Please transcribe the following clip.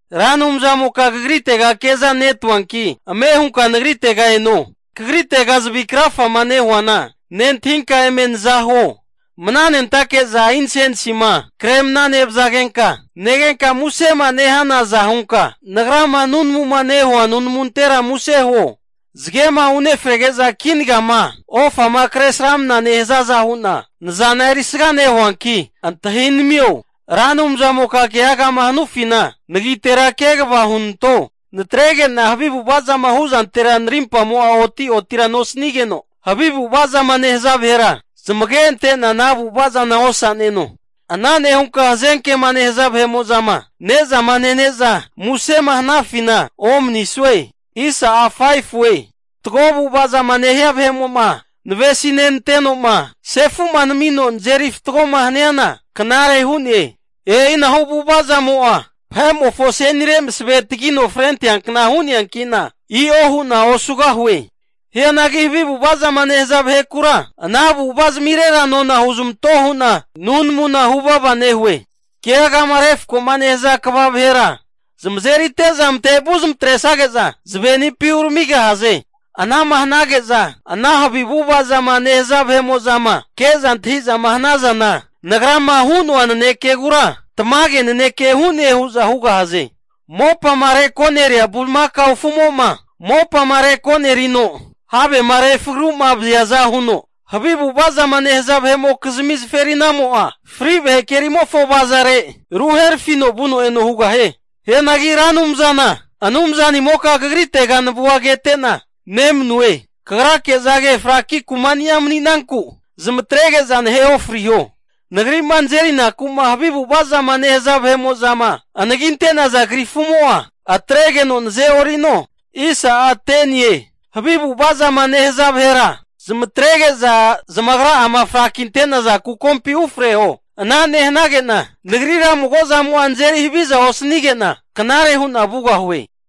Ra Anumzamoka Kagritega kezanetuanki, ame hunka nagritega eno. Kagritega zavi krafama nehuana, nentahinka eme nazahuo. Mana nentake'za insensima kre mna nevazagenka negenka musema nehanaza hunka, nagrama nunamuma nehua nunamuntera muse huo. Zagema unefrege'za kinagama ofama kresramna nehazaza hu'na, nazana erisga nehuanki antahinamio. Ra Anumzamoka keagama hanufina, nagitera kegava hunanto. Natrege'na havi avu'ava zama hu'zantera narimpamo'a oti'otira nosanigeno, havi avu'ava zama nehaza vahera zamage ante'na ana avu'ava zana osa'neno. Ana nehunka hazenkema nehaza vahe'mo'zama ne'zama nene'za musema hanafina omanisue. Fatgo avu'ava'ma nehia vahe'mo'ma navesinenanteno'ma sefu'ma namino nazeri fatgoma haniana knare hu'ne. E'inahu avu'ava zamo'a vahe'mofo asenire maseve tagino frenteankna hu'neanki'na, i'o hu'na osugahue. Hianagi havi ava'ava zama nehaza vahekura, ana avu'avazamirera nona huzamanto hu'na, nunamuna huvava nehue. Keagama refkoma nehaza kva vahera zamazerite'za matevu zamatresage'za zavenipi uramigahaze. Ana'ma hanage'za ana havi avu'ava zama nehaza vahe'mo'zama ke'za antahi'zama hanazana, nagrama hu'noa nanekegura tamage naneke hu'ne hu'za hugahaze. Mopama reko'neria bulimakao afumo'ma, mopama reko'nerino havema refaragu'ma vaziaza huno, havi avu'ava zama nehaza vahe'mokizmi zaferinamo'a, fri vahe kerimofo avazare ruherafino vuno eno hugahie. Hianagi Ra Anumzana, Anumzanimoka kagrite navua kete'na nemanue. Kagrake'za fraki kumani'a mani'nanku, zamatrege'za nahe ofriho. Nagri'ma nazerinaku'ma havi avu'ava zama nehaza vahe'mo'zama anaginte'naza krifumo'a, atregeno naze'orino. Havi avu'ava zama nehaza vahera zamatrege'za, zamagra'ama frakinte'naza kukompi ufreho. Ana nehanage'na nagrira mago zamo'a nazeri haviza osanige'na, knare hu'na vugahue.